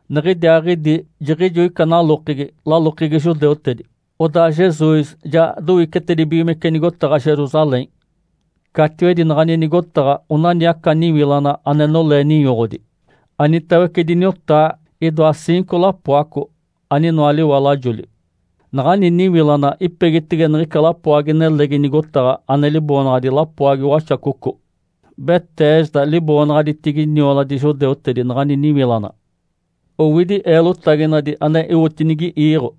Niɡ̶idiaaɡ̶idi jiɡ̶ijo ica nalokegi, lalokegi judeutedi. Odaa Jesus ja dowicetedibigimece nigotaɡ̶a Jerusalém. Catiwedi naɡ̶ani nigotaɡ̶a onani aca niwilana ane nolee ninyoɡ̶odi. Anitawece diniwotaa, idoa ciinco lapoaco aninoa liwalajoli. Naɡ̶ani niwilana ipegitege niɡ̶ica lapoagi-nelegi nigotaɡ̶a, ane liboonaɡ̶adi “Lapoagi waxacoco.” (“Betesda” liboonaɡ̶aditigi nioladi judeutedi naɡ̶ani niwilana.) Owidi eelotaginadi ane iwotinigi iiɡ̶o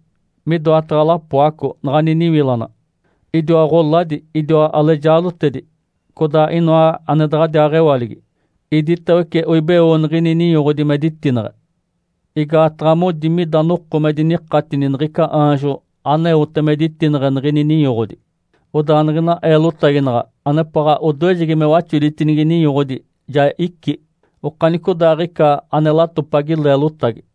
midoataɡ̶a lapoaco naɡ̶ani niwilana. Idiwa ɡ̶oladi, idiwa alejaadotedi, codaa inoa ane daɡ̶adiaa mewaligi. Iditawece oibeo niɡ̶ini ninyoɡ̶odi me ditineɡ̶e. Igaataɡ̶a modi mida noko me dinikatini niɡ̶ica aanjo aneote me ditineɡ̶e niɡ̶ini ninyoɡ̶odi. Odaa niɡ̶ina eelotaginaɡ̶a anepaɡ̶a odoejegi me waxoditinigi ninyoɡ̶odi ja icí okanicodaaɡ̶ica ane latopagi leelotagi.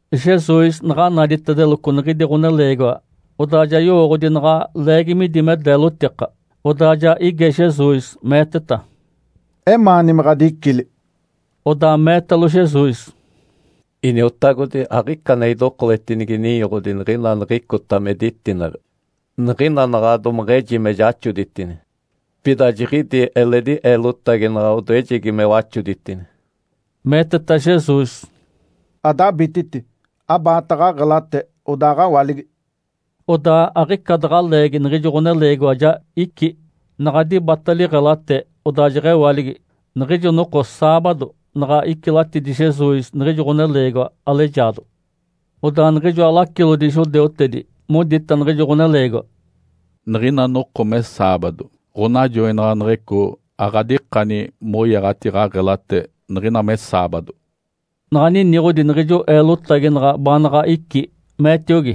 Jesus naɡ̶a naditedeloco niɡ̶idi ɡ̶oneleegiwa, odaa ja yowooɡ̶odi naɡ̶a leegi midi me deelotika. Odaa ja ige Jesus, meeteta, “Emaani me ɡ̶adicili?” Odaa meetalo Jesus, “Iniotagodi. Aɡ̶ica ane idokoletinigi ninyoɡ̶odi niɡ̶ina niɡ̶icota me ditineɡ̶e. Niɡ̶ina naɡ̶a domeɡ̶eji me jaxoditini, pida jiɡ̶idi eledi eelotaginaɡ̶a odoejegi me waxoditini”. Meeteta Jesus, “Adabititi. Abaata ɡ̶aɡ̶elate, odaaɡ̶awaligi”. Odaa aɡ̶ica daɡ̶a leegi niɡ̶ijo ɡ̶oneleegiwa ja icí. Naɡ̶a dibata liɡ̶elate, odaa jeɡ̶ewaligi. Niɡ̶ijo noko saabado naɡ̶a icilatidi Jesus niɡ̶ijo ɡ̶oneleegiwa alejaado. Odaa niɡ̶ijoa lacilodi judeutedi modita niɡ̶ijo ɡ̶oneleegiwa, “Niɡ̶ina noko me saabado. Ǥonajoinaɡ̶aneɡ̶eco aɡ̶adikani moyaɡ̶ati ɡ̶aɡ̶elate niɡ̶ina me saabado”. Naɡ̶a niniɡ̶odi niɡ̶ijo eelotaginaɡ̶a baanaɡ̶a icí, meetiogi,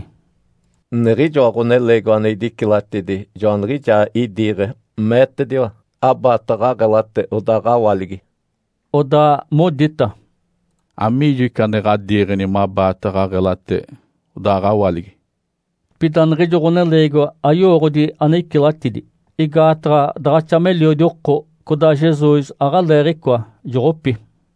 “Niɡ̶ijoa ɡ̶oneleegiwa ane idicilatidi joaniɡ̶ijaa idiiɡ̶e, meetediwa, ‘Abaata ɡ̶aɡ̶elate, odaaɡ̶awaligi’”. Odaa modita, “Amiijo ica ane ɡ̶adiiɡ̶eni mabaata ɡ̶aɡ̶elate, odaaɡ̶awaligi?” Pida niɡ̶ijo ɡ̶oneleegiwa ayowooɡ̶odi ane icilatidi. Igaataɡ̶a daɡ̶axa meliodi oko, codaa Jesus aɡ̶aleeɡ̶icoa, joɡ̶opi.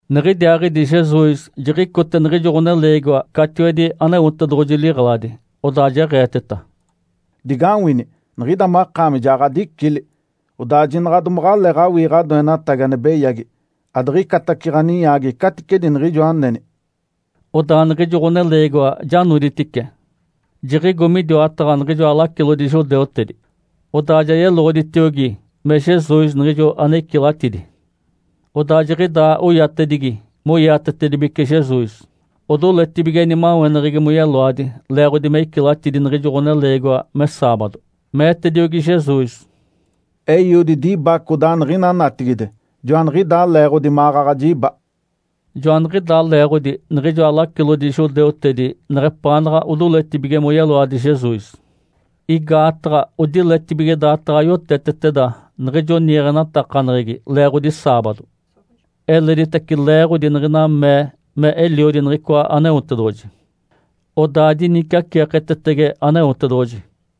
Niɡ̶idiaaɡ̶idi Jesus jiɡ̶icote niɡ̶ijo ɡ̶oneleegiwa catiwedi Aneotedoɡ̶oji liɡ̶eladi. Odaa jeɡ̶eeteta, “Digawini, niɡ̶ida makaami ja ɡ̶adicili. Odaa jinaɡ̶a domaɡ̶aleeɡ̶awii ɡ̶adoenatagi ane beyagi, adiɡ̶icatace ɡ̶aninyaagi caticedi niɡ̶ijo aneni”. Odaa niɡ̶ijo ɡ̶oneleegiwa ja noditice, jiɡ̶igo midiwataɡ̶a niɡ̶ijoa lacilodi judeutedi. Odaa ja yeloɡ̶oditiogi me Jesus niɡ̶ijo ane icilatidi. Odaa jiɡ̶idaa oyatedigi moiatetedibeci Jesus, odoletibige nimaweneɡ̶egi moyeloadi leeɡ̶odi me icilatidi niɡ̶ijo ɡ̶oneleegiwa me saabado. Meetediogi Jesus, “Eiodi diba codaa niɡ̶ina natigide, joaniɡ̶idaa leeɡ̶odi maɡ̶aɡ̶a jiba”. Joaniɡ̶idaa leeɡ̶odi niɡ̶ijoa lacilodi judeutedi neɡ̶epaanaɡ̶a odoletibige moyeloadi Jesus. Igaataɡ̶a odiletibige daataɡ̶a yoteteteda niɡ̶ijo niiɡ̶enatakaneɡ̶egi leeɡ̶odi saabado, eleditace leeɡ̶odi niɡ̶ina mee me Eliodi niɡ̶icoa Aneotedoɡ̶oji, odaa diniciaceeketetege Aneotedoɡ̶oji.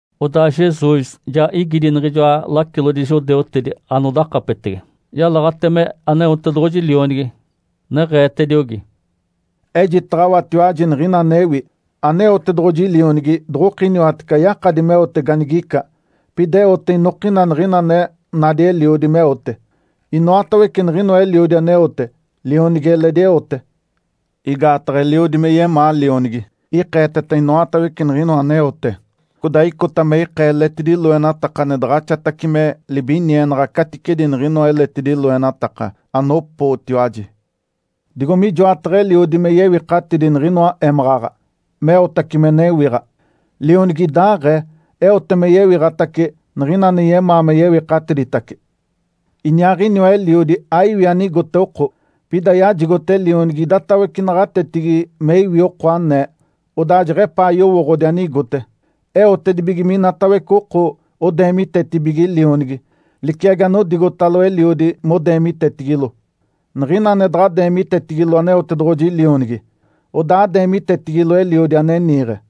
Odaa Jesus ja igidi niɡ̶ijoa lacilodi judeutedi anodakapetege, yalaɡ̶ate me Aneotedoɡ̶oji Lionigi, neɡ̶eetediogi, “Ejitaɡ̶awatiwaji niɡ̶ina anewi. Aneotedoɡ̶oji Lionigi doɡ̶okiniwatece ayakadi meote ganigica. Pida eote inokina niɡ̶ina ane nadi Eliodi meote. Inoatawece niɡ̶inoa Eliodi aneote, Lionigi eledi eote. Igaataɡ̶a Eliodi yemaa Lionigi, ikeeteta inoatawece niɡ̶inoa aneote. Codaa icota me ikee eletidi loenataka ane daɡ̶axatace me libinienaɡ̶a caticedi niɡ̶inoa eletidi loenataka, anopootiwaji. Digo mijoataɡ̶a Eliodi me yewikatidi niɡ̶inoa émaɡ̶aɡ̶a, meotace me newiɡ̶a, Lionigi idaaɡ̶ee eote me yewiɡ̶atace niɡ̶ina ane yemaa me yewikatiditace. Iniaaɡ̶iniwa Eliodi aiwi ane igote oko, pida yajigote Lionigi idatawece naɡ̶atetigi me iwi oko anee, odaa jeɡ̶epaa yowooɡ̶odi anigote. Eotedibige minatawece oko odeemitetibige Lionigi, liciagi anodigotalo Eliodi modeemitetigilo. Niɡ̶ina ane daɡ̶a deemitetigilo Aneotedoɡ̶oji Lionigi, odaa adeemitetigilo Eliodi ane niiɡ̶e.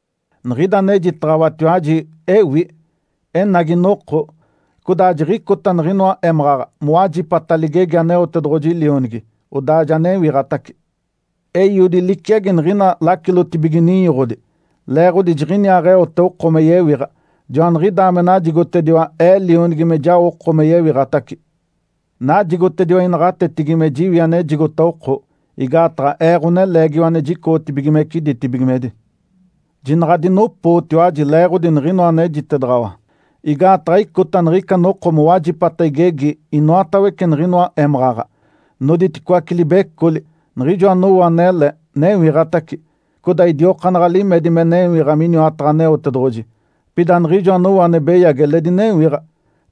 Niɡ̶ida anejitaɡ̶awatiwaji, ewi. Enagi noko, codaa jiɡ̶icota niɡ̶inoa émaɡ̶aɡ̶a mowajipata ligegi Aneotedoɡ̶oji Lionigi, odaa ja newiɡ̶atace. Eiodi liciagi niɡ̶ina lacilotibige ninyoɡ̶odi, leeɡ̶odi jiɡ̶iniaaɡ̶eote oko me yewiɡ̶a. Joaniɡ̶idaa me najigotediwa Ee Lionigi me jao oko me yewiɡ̶atace. Najigotediwa inaɡ̶atetigi me jiwi anejigota oko, igaataɡ̶a Ee, Ǥoneleegiwa ane jicoɡ̶otibigimece ditibigimedi. Jinaɡ̶a adinopootiwaji leeɡ̶odi niɡ̶inoa anejitedaɡ̶awa. Igaataɡ̶a icota niɡ̶ica noko mowajipata igegi inoatawece niɡ̶inoa émaɡ̶aɡ̶a. Noditicoaci libecoli. Niɡ̶ijo anowo anele, newiɡ̶atace, codaa idiokaanaɡ̶a limedi me newiɡ̶a miniwataɡ̶a Aneotedoɡ̶oji. Pida niɡ̶ijo anowo ane beyagi eledi newiɡ̶a,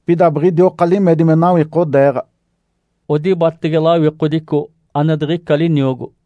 pida biɡ̶idioka limedi me nawikodeeɡ̶a.” (Odibatege lawikodico ane diɡ̶ica liniogo.)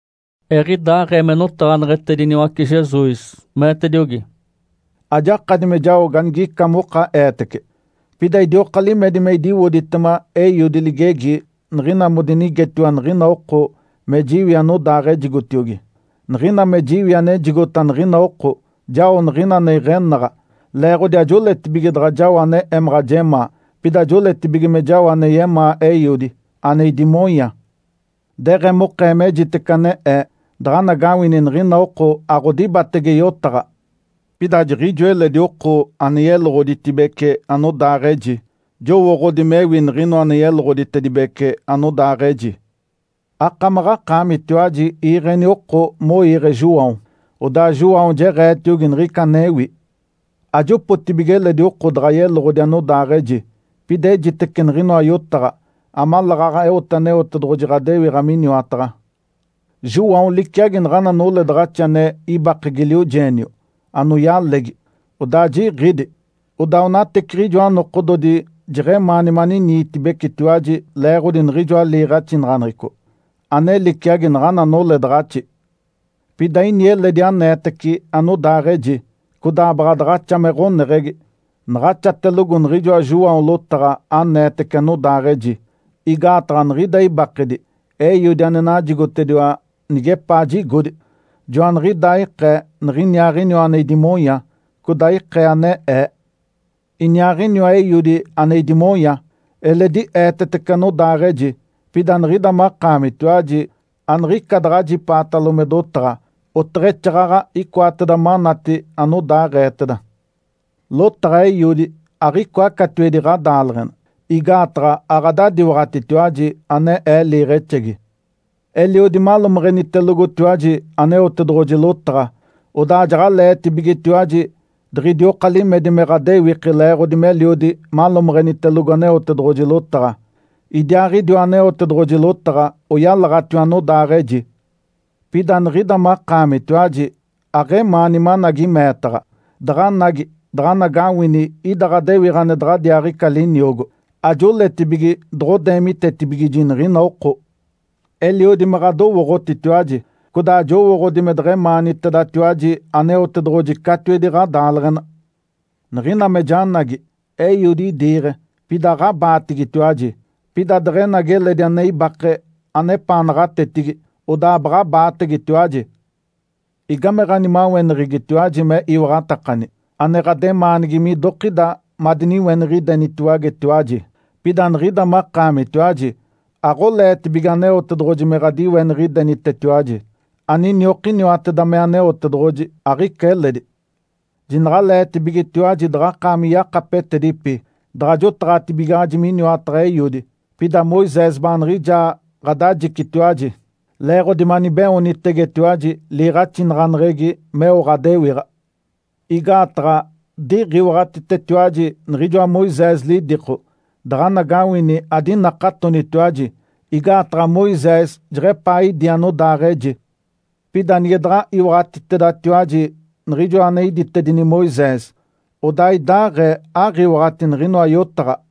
Eɡ̶idaaɡ̶ee me notaɡ̶aneɡ̶etediniwace Jesus, meetediogi, “Ajakadi me jao ganigica moka eetece. Pida idioka limedi me idiwoditema Eiodi ligegi niɡ̶ina modinigetiwa niɡ̶ina oko me jiwi anodaaɡ̶ejigotiogi. Niɡ̶ina me jiwi anejigota niɡ̶ina oko, jao niɡ̶ina ane iɡ̶enaɡ̶a, leeɡ̶odi ajoletibige daɡ̶a jao ane emaɡ̶a jemaa. Pida joletibige me jao ane yemaa Eiodi, ane idimonya. Deɡ̶emokee mejitece ane Ee, daɡ̶anagawini niɡ̶ina oko aɡ̶odibatege yotaɡ̶a. Pida jiɡ̶ijo eledi oko ane yeloɡ̶oditibece anodaaɡ̶eji. Jowooɡ̶odi mewi niɡ̶inoa ane yeloɡ̶oditedibece anodaaɡ̶eji. Akamaɡ̶akaamitiwaji iiɡ̶eni oko moige João. Odaa João jeɡ̶eetiogi niɡ̶ica anewi. Ajopotibige eledi oko daɡ̶a yeloɡ̶odi anodaaɡ̶eji. Pida ejitece niɡ̶inoa yotaɡ̶a, amaleeɡ̶aɡ̶a eote Aneotedoɡ̶oji ɡ̶adewiɡ̶a miniwataɡ̶a. João liciagi naɡ̶ana noledaɡ̶axi ane ibake giliojeenio, anoyalegi, odaa jiɡ̶ídi. Odaa onateciɡ̶ijoa nokododi jeɡ̶emaani maniniitibecitiwaji leeɡ̶odi niɡ̶ijoa liiɡ̶axinaɡ̶aneɡ̶eco, ane liciagi naɡ̶ana noledaɡ̶axi. Pida ini eledi aneetece anodaaɡ̶eji, codaa baɡ̶a daɡ̶axa me ɡ̶oneɡ̶egi naɡ̶axatelogo niɡ̶ijoa João lotaɡ̶a aneetece anodaaɡ̶eji. Igaataɡ̶a niɡ̶ida ibakedi Eiodi ane najigotediwa nigepaa jigodi, joaniɡ̶idaa ikee niɡ̶iniaaɡ̶iniwa ane idimonya, codaa ikee ane Ee. Iniaaɡ̶iniwa Eiodi ane idimonya, eledi eetetece anodaaɡ̶eji. Pida niɡ̶ida makaamitiwaji aniɡ̶ica daɡ̶ajipaatalo me dotaɡ̶a, oteɡ̶exaaɡ̶aɡ̶a icoateda manati anodaaɡ̶eeteda. Lotaɡ̶a Eiodi aɡ̶icoa catiwedi ɡ̶adaaleɡ̶ena, igaataɡ̶a aɡ̶adadiwaɡ̶atitiwaji, ane Ee liiɡ̶exegi. Eliodi malomeɡ̶enitelogotiwaji Aneotedoɡ̶oji lotaɡ̶a, odaa jaɡ̶aleetibigetiwaji diɡ̶idioka limedi me ɡ̶adewiki leeɡ̶odi meliodi malomeɡ̶enitelogo Aneotedoɡ̶oji lotaɡ̶a. Idiaaɡ̶idiwa Aneotedoɡ̶oji lotaɡ̶a oyalaɡ̶atiwa anodaaɡ̶eji. Pida niɡ̶ida makaamitiwaji aɡ̶emaani managi meetaɡ̶a, daɡ̶anagi daɡ̶anagawini ida ɡ̶adewiɡ̶a ane daɡ̶adiaaɡ̶ica liniogo. Ajoletibige doɡ̶odeemitetibigiji niɡ̶ina oko. Eliodi me ɡ̶adowooɡ̶otitiwaji. Codaa jowooɡ̶odi me deɡ̶emaanitedatiwaji Aneotedoɡ̶oji catiwedi ɡ̶adaaleɡ̶ena. Niɡ̶ina me janagi, Eiodi idiiɡ̶e, pida aɡ̶abaatigitiwaji. Pida deɡ̶enagi eledi ane ibake anepaa naɡ̶atetigi, odaa baɡ̶abaategetiwaji. Igame ɡ̶animaweneɡ̶egitiwaji me iwaɡ̶atakani? Ane ɡ̶ademaanigi midokida madiniweniɡ̶idenitiwagetiwaji. Pida niɡ̶ida makaamitiwaji aɡ̶oleetibige Aneotedoɡ̶oji me ɡ̶adiweniɡ̶idenitetiwaji. Aniniokiniwateda me Aneotedoɡ̶oji, aɡ̶ica eledi. Jinaɡ̶aleetibigetiwaji daɡ̶akaami yakapetedipi, daɡ̶a jotaɡ̶atibigaɡ̶aji miniwataɡ̶a Eiodi. Pida Moisés baaniɡ̶ijaa ɡ̶adajicitiwaji, leeɡ̶odi manibeoonitegetiwaji liiɡ̶axinaɡ̶aneɡ̶egi meo ɡ̶adewiɡ̶a. Igaataɡ̶a diɡ̶iwaɡ̶atitetiwaji niɡ̶ijoa Moisés lidiko, daɡ̶anagawini adinakatonitiwaji, igaataɡ̶a Moisés jeɡ̶epaa idí anodaaɡ̶eji. Pida nige daɡ̶a iwaɡ̶atitedatiwaji niɡ̶ijoa ane iditedini Moisés, odaa idaaɡ̶ee aɡ̶iwaɡ̶ati niɡ̶inoa yotaɡ̶a”.